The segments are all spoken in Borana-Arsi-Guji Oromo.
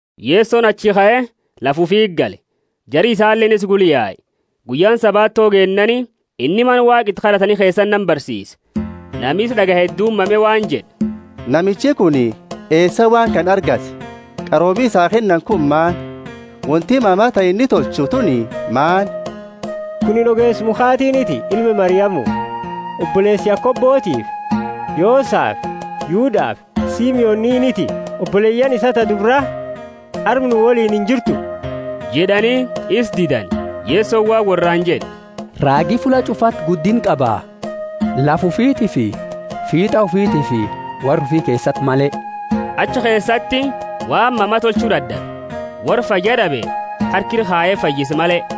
Yesoni achii kae, lafa ufiti gale; jari isaleeni isa gula yae. Guyyaani Sabato geennaani, inni Mana Waaqa iti kad'atani keesati nama barsiise. Nami isa d'agaye hedduuni mame waan jed'e, Namichi kuni eesaa waan kana argate? Qaroomi isaa kennani kunini maani? Wonti mama ta inni tolchu tuni maani? Kunini ogeesa mukhatiiniti, ilma Mariamu, oboleesa Yakobotiifi Yosafi Yudafi Simoniiniti? Oboleyaani isaa ta dubra arma nu woliini injirtu? jed'ani, isa didani. Yesoni waan worraani jed'e, Raagi fulla ch'ufati guddinna qaba, lafa ufitiifi fiit'a ufitiifi worra ufi keesati male. Achi keesati waan mama tolchu dad'abe, worra fayyad'abe harka ira kaye fayyise male.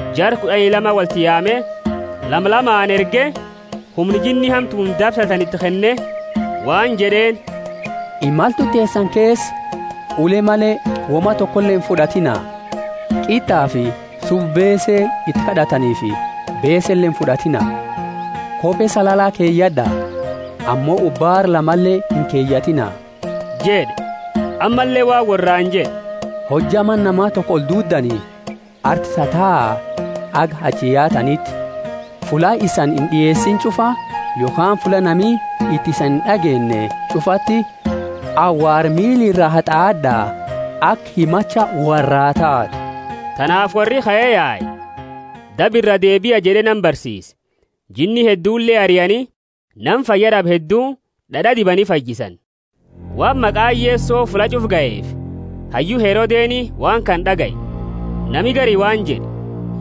Jara kud'ani lama wolti yaame, lama lamaani erge, humna jinni hamtuuni dabsatani iti kenne waan jed'eeni, Imaltu teesani keesa, ule male, woma tokole infud'atiina: qit'afi subba beese iti kad'ataniifi beesele infud'atiina. Kope salala keyad'a, ammo ubaara lamale inkeyatina jed'e. Ammalle waan worraani jed'e, Hojja mana nama toko olduuddani, arti tataa, haga achi yaataniti. Fulla isani ind'ieesine ch'ufa, yokhaani fulla nami iti isani ind'ageenne ch'ufati, awaara miila ira hat'aad'a aka himacha worraa taatu. Tanaafi worri kae yae, Daba iraa deebia jed'e nama barsiise. Jinni heddule ariani, nama fayyad'abe heddu d'ad'a dibani fayyisani. Waan maqaani Yeso fulla ch'ufa gaheefi, hayyu Herodeni waan kana d'agaye. Nami gari waan jed'e,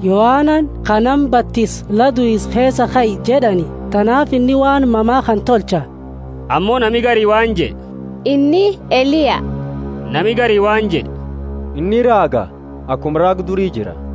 Yohanani ka nama batisu la duisa keesaa kae jed'ani, tanaafi inni waan mama kana tolcha. Ammo nami gari waan jed'e, Inni Eliya. Nami gari waan jed'e, Inni raaga, akuma raaga duri jira.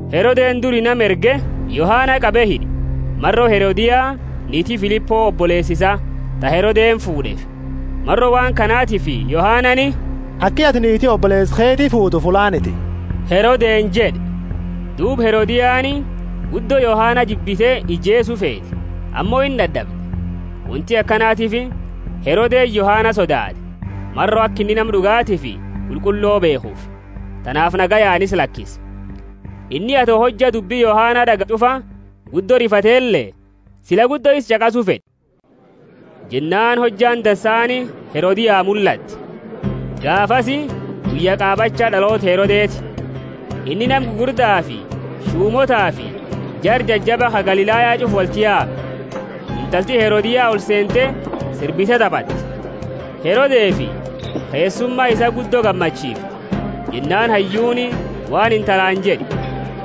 Herodeni duri nama erge, Yohana qabe hid'e, maro Herodia, niiti Filipo, oboleesa isaa, ta Herodeni fuud'eefi. Maro waan kanatifi Yohanani, Aki atini niiti oboleesa keeti fuutu fullaaniti Herodeni jed'e. Duuba Herodiani guddo Yohana jibbite ijeesu feete. Ammo indad'abde. Wonti akanatiifi Herodeni Yohana sodaate, maro aka inni nama d'ugatiifi qulqullo beekhufi, tanaafi nagayaani isa lakise. Inni ato hojja dubbi Yohana d'agayu ch'ufa guddo rifatele sila guddo isa ch'aqasu fed'e. Jennaani hojjaani dansaani Herodia mullatte. Gaafasi guyya qaabacha d'aloota Herodeti. Inni nama gugurdafi shumootafi jara jajaba ka Galilaya ch'ufa wolti yaame. Intalti Herodia olseente, sirbite tabatte, Herodefi keessuma isaa guddo gammachiifte. Jennaani hayyuuni waan intalaani jed'e,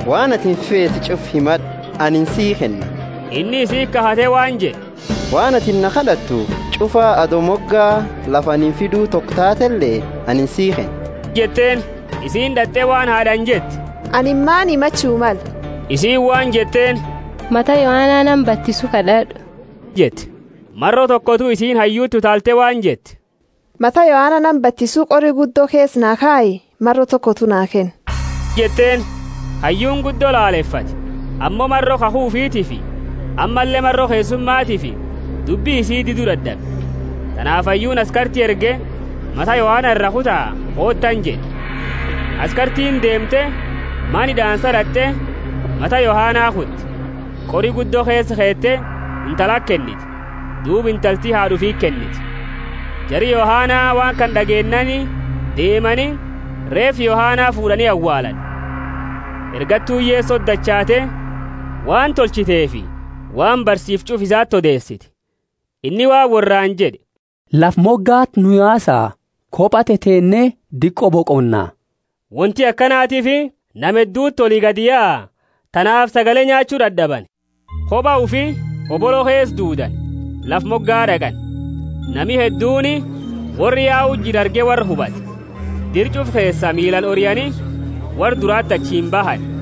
Waan atini feetu ch'ufa himad'u, anini sii kenna. Inni isiti kakhate waan jed'e, Waan atini na kad'attu ch'ufa, ato moga lafa ani fidu toko taatele, anini sii kenna jed'eeni. Isiini d'at'e waan haad'aani jette, Anini maani himachu male? Isiini waan jetteeni, Mata Yohana nama batisu kad'ad'u jette. Maro tokotu isiini hayyuti utaalte waan jette, Mata Yohana nama batisu qori guddo keesa naa kayi, maro tokotu naa kenni jetteeni. Hayyuuni guddo lalefate, ammo maro kakhu ufitiifi ammalle maro keessumatiifi dubbi isii didu dad'abe. Tanaafi hayyuuni askarti erge, Mata Yohana ira kuta, kootaani jed'e. Askartiini deemte, mana hid'aansa d'at'e, mata Yohana kute, qori guddo keesa keete, intalati kennite, duuba intalti haad'a ufiti kennite. Jari Yohana waan kana d'ageennaani deemani, reefa Yohana fuud'ani awaalani. Ergattuuni Yesoti dachaate, waan tolchiteefi waan barsiifte ch'ufa isati odeesite. Inni waan worraani jed'e, Lafa mogati nu yaasa koba teteenne diqo boqonna. Wonti akanatiifi nama hedduti oli gadi yaa tanaafi sagale nyaachu dad'abani. Koba ufi hobolo keesa duudani, lafa moga d'aqani. Nami hedduuni worra yau jiru arge worra hubate, dira ch'ufa keesaa miilaani oriani, worra durati achiini bahani.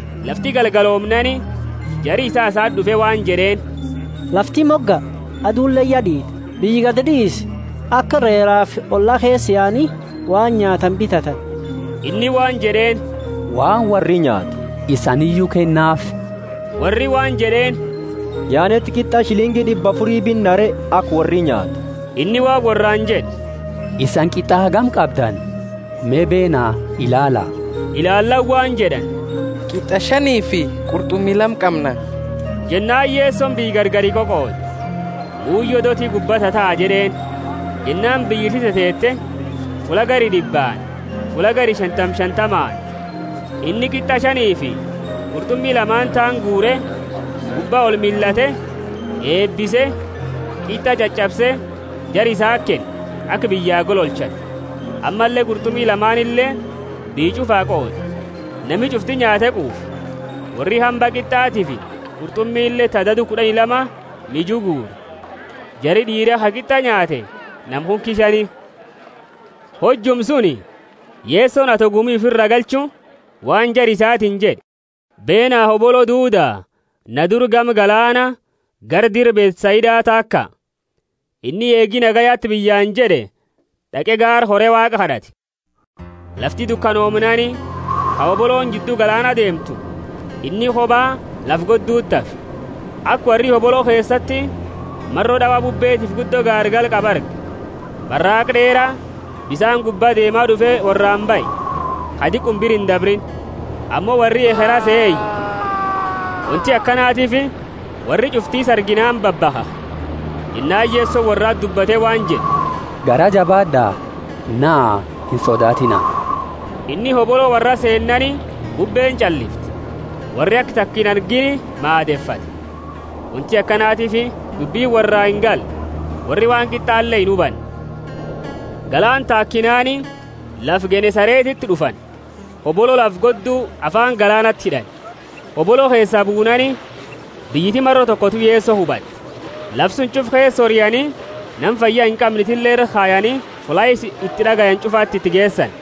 Lafti galgaloomnaani, jari isaa isati d'ufe waan jed'eeni, Lafti moga, aduleeni ya d'iite, biyya gadi d'iisi, aka reerafi olla keesa yaani waan nyaatani bitatani. Inni waan jed'eeni, Waan worri nyaatu isaniiyu kennaafi. Worri waan jed'eeni, Yaaneti qit'a shilingi d'ibba afuri binna re, aka worri nyaatu? Inni waan worraani jed'e, Isani qit'a hagami qabdani? Me, beena, ilaala. Ilaallaani waan jed'ani, Qit'a shanifi qurt'umi lama qamna. Jennaani Yesoni biyya gargari qoqoode, Buuyo dooti gubba tataa jed'eeni. Jennaani biyyiti teteete, fulla gari d'ibbaani, fulla gari shantama shantamaani. Inni qit'a shanifi qurt'umi lamaani taani guure, gubba olmillate, eebise, qit'a ch'ach'abse, jara isati kenne, aka biyya gololchani. Ammalle qurt'umi lamaanile biyya ch'ufaa qoode. Nami ch'ufti nyaate quufe. Worri hamba qit'atiifi qurt'umile ta dadu kud'ani lama miju guure. Jari d'iira ka qit'a nyaate nama kunki shani. Hojuma suni Yesoni ato gumi ufiraa galchu, waan Jara isaatiini jed'e beena hobolo duuda na dura gama galaana gara dira Bethsaida taaka. Inni eegi nagayati biyyaani jed'e d'aqe gaara kore Waaqa kad'ate. Lafti dukanoomnaani, ka hobolooni jiddu galaana deemtu, inni koba lafa godduti hafe. Aka worri hobolo keesati maro d'awa bubbeetifi guddo gaargala qabu arge, baraaqa d'eera bisaani gubba deema d'ufe worraani bahe, ka diquma bira indabriini. Ammo worri ekhera sehe iye. Wonti akanatiifi worri ch'ufti isa arginaani babakhakhe. Jennaani Yesoni worrati dubbate waan jed'e, Garaa jabaad'a, naa, insodaatiina. Inni hobolo worra seennaani, bubbeeni ch'allifte. Worri aka taka inargiini maadefate. Wonti akanatiifi dubbini worraa ingalle, worri waan qit'ale inhubanne. Galaana taakinaani, lafa Genesaretiti d'ufani, hobolo lafa goddu afaani galaanati hid'ani. Hobolo keesaa buunaani, biyyiti maro tokotu Yeso hubatte. Lafa suni ch'ufa keesa oriani nama fayya inqamne itille ira kayani fulla isa iti d'agayani ch'ufati iti geesani.